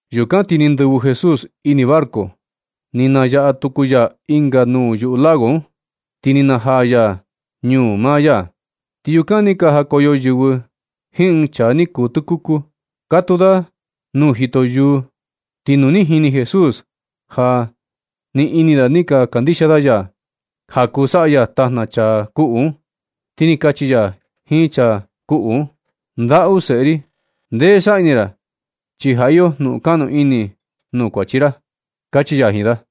Yukan ti ni ndɨvɨ Jesús ini barco, ni nayaꞌa tuku ya ɨnga nuu yuꞌu lago un. Ti ni najaa ya ñuu maa ya. Ti yukan ni ka jakoyo yɨvɨ jiin ɨɨn chaa ni kuu tɨkuku, katuu da nuu jito yuu. Ti nu ni jini Jesús ja ni ini da ni ka kandixia da ya ja kuu saꞌa ya tajna chaa kuꞌu un, ti ni kachi ya jiin chaa kuꞌu un: ―Ndaꞌu seꞌe ri, ndee saꞌa ni ra, chi ja iyo jnu kaꞌnu ini nuu kuachi ra ―kachi ya jiin da.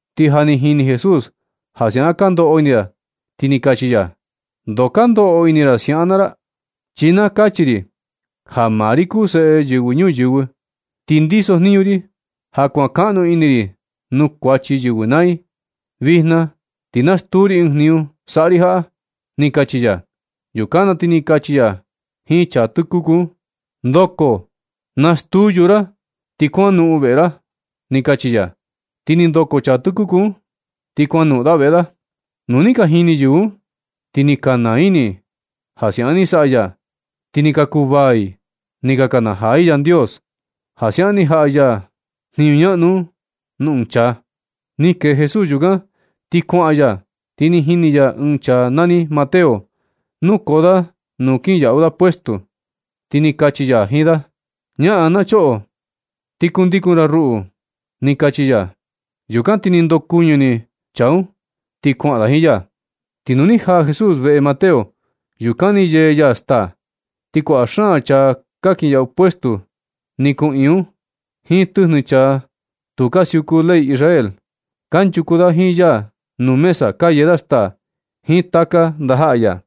Ti ja ni jini Jesús ja siaꞌan ka ndoꞌo ini da, ti ni kachi ya: ―¿Ndoo ka ndoꞌo ini ra siaꞌan naa ra? Chi na kachi ri ja maa ri kuu Seꞌe Yɨvɨ Ñuyɨvɨ, ti ndisojniñu ri ja kuankaꞌnu ini ri nuu kuachi yɨvɨ naa i. Vijna ti na stuu ri ɨɨn jniñu saꞌa ri jaꞌa ―ni kachi ya. Yukan na ti ni kachi ya jiin chaa tɨkuku un: ―Ndoko, nastuu yuu ra, ti kuanoꞌon veꞌe ra ―ni kachi ya. Ti ni ndoko chaa tɨkuku un, ti kuanoꞌon da veꞌe da. Nu ni ka jini yɨvɨ un, ti ni ka naa ini i ja siaꞌan ni saꞌa ya. Ti ni ka kuvaa i ni ka nakanajaa i Yandios ja siaꞌan ni jaꞌa ya jniñu ñaꞌnu un nuu ɨɨn chaa. Ni kee Jesús yukan ti kuaꞌan ya, ti ni jini ya ɨɨn chaa nani Mateo, nukoo da nuu kinyaꞌu da puestu, ti ni kachi ya jiin da: ―Ñaꞌan na choꞌo, ti kundikun ra ruꞌu ―ni kachi ya. Yukan ti ni ndokuɨñɨ ni chaa un, ti kuaꞌan da jiin ya. Ti nu ni jaa Jesús veꞌe Mateo yukan ni yee ya staa. Ti kuaꞌa xaan chaa ka kinyaꞌu puestu ni kuꞌiin un, jiin tɨjnɨ chaa tu ka siuku ley Israel. Kanchuku da jiin ya nuu mesa ka yee da staa, jiin taka ndajaꞌa ya.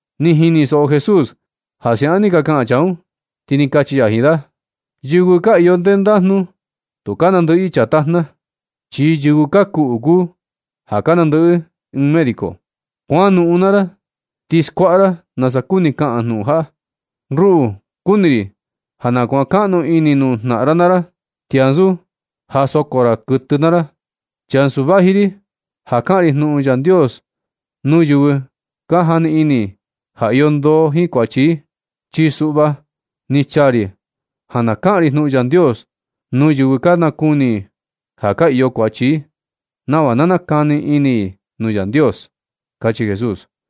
Ni jinisoꞌo Jesús ja siaꞌan ni ka kaꞌan chaa un, ti ni kachi ya jiin da: ―Yɨvɨ ka iyo ndendajnu tu ka nandɨꞌɨ i chaa tajna, chi yɨvɨ ka kuꞌu kuu ja ka nandɨꞌɨ ɨɨn médico. Kuanoꞌon naa ra ti skuaꞌa ra nasa kuni kaꞌan jnuꞌun jaꞌa: “Ruꞌu kuni ri ja na kuankaꞌnu ini nuu jnaꞌan ra naa ra, ti ansu ja soko ra kɨtɨ naa ra.” Chi ansu vaji ri ja kaꞌan ri jnuꞌun Yandios nuu yɨvɨ ka jani ini ja iyo ndoo jiin kuachi i. Chi suꞌva ni chaa ri ja na kaꞌan ri jnuꞌun Yandios nuu yɨvɨ ka nakuni ja ka iyo kuachi i, nava na nakani ini i nuu Yandios ―kachi Jesús.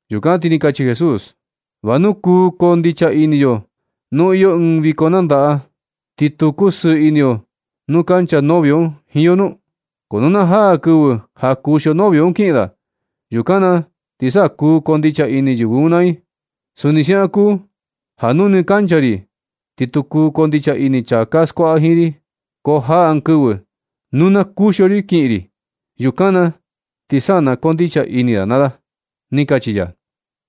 Yukan ti ni kachi Jesús: ―¿Va nu kuu koo ndicha ini yo nu iyo ɨɨn viko nandaꞌa, ti tu kusɨɨ ini yo nu kancha novio un jiin yo nu? Ko nu na jaa kɨvɨ ja kuxio novio un kiꞌin da, yukan na ti sa kuu koo ndicha ini yɨvɨ un naa i. Suni siaꞌan kuu ja nu nɨ kancha ri ti tu kuu koo ndicha ini chaa ka skuaꞌa jiin ri. Ko jaa ɨɨn kɨvɨ nu na kuxio ri kiꞌin ri, yukan na ti sa na koo ndicha ini da naa da ―ni kachi ya.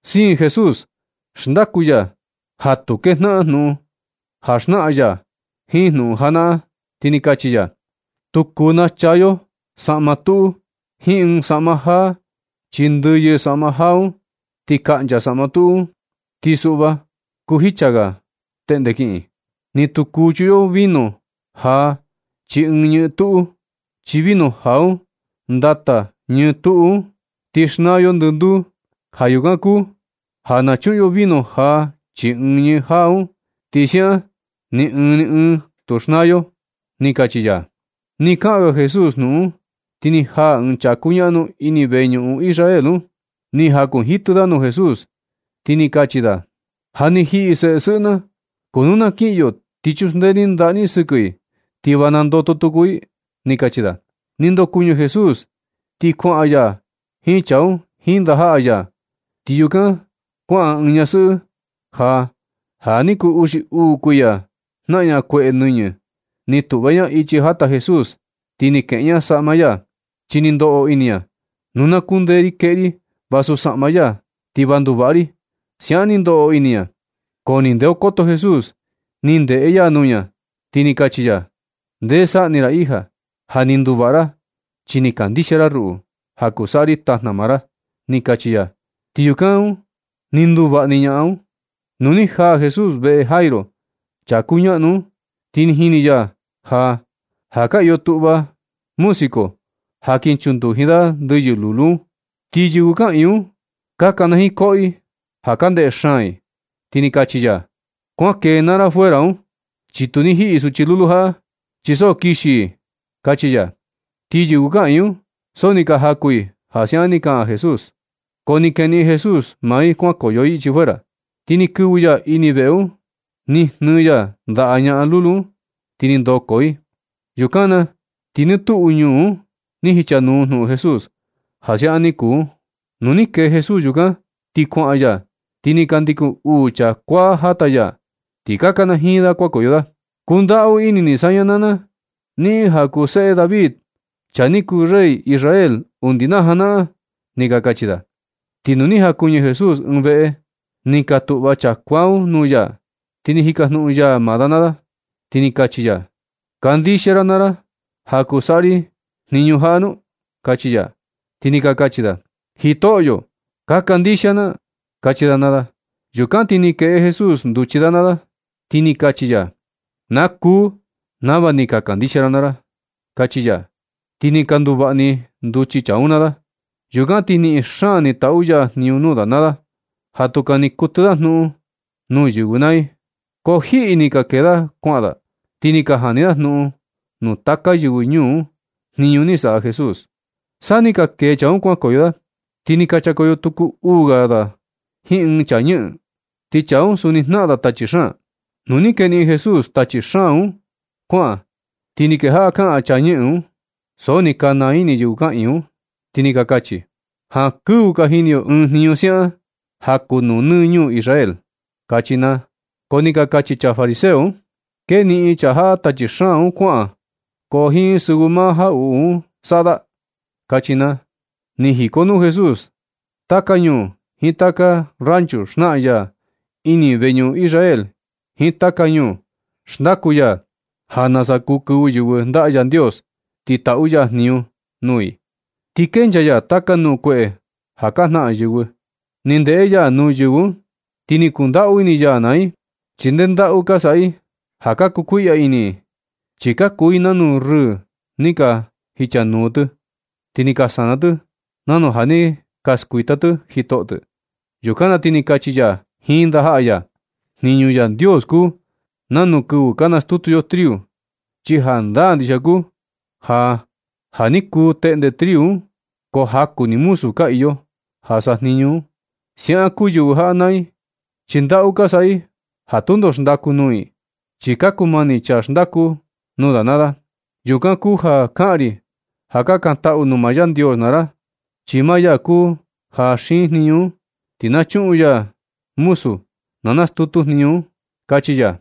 Siin Jesús xndaku ya ja tu kejnaꞌan jnuꞌun jaa ja xnaꞌan ya, jiin jnuꞌun janaꞌan, ti ni kachi ya: ―Tu kuu nachaa yo saꞌma tuꞌu jiin ɨɨn saꞌma jaa, chi ndɨyɨ saꞌma jaa un ti kaꞌncha saꞌma tuꞌu un, ti suꞌva kuu jicha ga teꞌnde kiꞌin. Ni tu kuu chuꞌun yo vino jaa chii ɨɨn ñɨɨ tuꞌu, chi vino jaa un ndata ñɨɨ tuꞌu un, ti xnaa yo ndɨnduu. Ja yukan kuu ja na chuꞌun yo vino jaa chii ñɨɨ jaa un, ti siaꞌan ni ɨɨn ni ɨɨn tu xnaa yo ―ni kachi ya. Ni kaꞌan ga Jesús jnuꞌun un, ti ni jaa ɨɨn chaa kuñaꞌnu ini ɨɨn veñuꞌun Israel un, ni jakunjitɨ da nuu Jesús, ti ni kachi da: ―Ja ni jiꞌi seꞌe sɨꞌɨ na, ko nu na kiꞌin yo, ti chuxndee ni ndaꞌa ni sɨkɨ i, ti va nandoto tuku i ―ni kachi da. Ni ndokuɨñɨ Jesús ti kuaꞌan ya jiin chaa un jiin ndajaꞌa ya. Ti yukan kuaꞌan ɨɨn ñasɨꞌɨ ja ja ni kuu uxi uu kuiya jnaꞌan ña kueꞌe nɨñɨ. Ni tuꞌva ña ichi jata Jesús ti ni kueꞌe ña saꞌma ya, chi ni ndoꞌo ini ña: “Nu na kundee ri kueꞌe ri vasu saꞌma ya, ti va nduvaꞌa ri”, siaꞌan ni ndoꞌo ini ña. Ko ni ndeokoto Jesús, ni ndeꞌe ya nuu ña, ti ni kachi ya: ―Ndee saꞌni ra hija, ja ni nduvaꞌa ra chi ni kandixia ra ruꞌu, ja kuu saꞌa ri tajna maa ra ―ni kachi ya. Ti yukan un ni nduvaꞌa ni ñaꞌan un. Nu ni jaa Jesús veꞌe Jairo, chaa kuñaꞌnu un, ti ni jini ya ja, ja ka iyo tuꞌva música ja kin chunduji da ndɨyɨ lulu un, ti yɨvɨ kaꞌiin un ka kanajiin koꞌo i ja ka ndeꞌe xaan i, ti ni kachi ya: ―Kuan kee naa ra fuera un, chi tu ni jiꞌi suchi lulu jaꞌa, chi so kixi i ―kachi ya. Ti yɨvɨ kaꞌiin un so ni ka jaku i ja siaꞌan ni kaꞌan Jesús. Ko ni keniꞌin Jesús maa i kuankoyo i ichi fuera, ti ni kɨvɨ ya ini veꞌe un, ni jnɨɨ ya ndaꞌa ñaꞌan lulu un, ti ni ndoko i. Yukan na ti nɨ tuꞌu ñuu un ni jichanuu jnuꞌun Jesús ja siaꞌan ni kuu un. Nu ni kee Jesús yukan ti kuaꞌan ya, ti ni ka ndikun uu chaa kuaa jata ya, ti ka kanajiin da kuajakoyo da: ―¡Kundaꞌu ini ni saña naa na, niꞌin ja kuu seꞌe David, chaa ni kuu rey Israel undi na janaꞌan! ―ni ka kachi da. Ti nu ni jakuɨñɨ Jesús ɨɨn veꞌe, ni ka tuꞌva chaa kuaa un nuu ya, ti ni jikajnuꞌun ya maa da naa da, ti ni kachi ya: ―¿Kandixia ra naa ra ja kuu saꞌa ri jniñu jaꞌa nu? ―kachi ya. Ti ni ka kachi da: ―Jitoꞌyo, ka kandixia na ―kachi da naa da. Yukan ti ni kueꞌe Jesús nduchi da naa da, ti ni kachi ya: ―Na kuu nava ni ka kandixia ra naa ra ―kachi ya. Ti ni ka nduvaꞌa ni nduchi chaa un naa da. Yukan na ti niꞌin xaan ni taꞌu ya jniñu nuu da naa da, ja tu kani kutɨ da jnuꞌun nuu yɨvɨ naa i. Ko jiꞌi ni ni ka kee da kuaꞌan da, ti ni ka jani ni da jnuꞌun nuu taka yɨvɨ ñuu un jniñu ni saꞌa Jesús. San ni ka kee chaa un kuankoyo da, ti ni ka chakoyo tuku uu ga da jiin ɨɨn chaa ñɨꞌɨn, ti chaa un suni jnaꞌan da tachi xaan. Nu ni keniꞌin Jesús tachi xaan un kuaꞌan, ti ni kejaꞌa kaꞌan chaa ñɨꞌɨn un, so ni ka naa ini yɨvɨ kaꞌiin un, ti ni ka kachi: ―Jankɨvɨ ka jini yo ɨɨn jniñu siaꞌan, ja kuu nuu nɨ ñuu Israel ―kachi naa. Ko ni ka kachi chaa fariseo un: ―Keniꞌin chaa jaꞌa tachi xaan un kuaꞌan, ko jiin sɨvɨ maa jaꞌuꞌu un saꞌa da ―kachi naa. Ni jikonuu Jesús taka ñuu jiin taka ranchu xnaꞌan ya ini veñuꞌun Israel jiin taka ñuu, xndaku ya ja nasa kuu kɨvɨ yɨvɨ ndaꞌa Yandios, ti taꞌu ya jniñu nuu i. Ti kenchaa ya taka nuu kueꞌe ja ka jnaꞌan yɨvɨ. Ni ndeꞌe ya nuu yɨvɨ un ti ni kundaꞌu ini ya naa i, chi nde ndaꞌu ka saꞌa i, ja ka kuu kuiꞌya ini i. Chi ka kuu i nanu rɨɨ ni ka jichanuu, ti ni ka sana tɨ nanu ja ni ka skuita tɨ jitoꞌo tɨ. Yukan na ti ni kachi ya jiin ndajaꞌa ya: ―Jniñu Yandios kuu nanu kɨvɨ ka nastutu yo triu, chi jandaa ndixia kuu ja, ja ni kuu teꞌnde triu un ko jaku ni muzu ka iyo ja sajniñu un. Siaꞌan kuu yɨvɨ jaꞌa naa i, chi ndaꞌu ka saꞌa i ja tundo xndaku nuu i, chi ka kumani chaa xndaku un naa da. Yukan kuu ja kaꞌan ri ja kakantaꞌu nuu maa Yandios naa ra, chi maa ya kuu ja xiin jniñu un, ti na chuꞌun ya muzu na nastutu jniñu un ―kachi ya.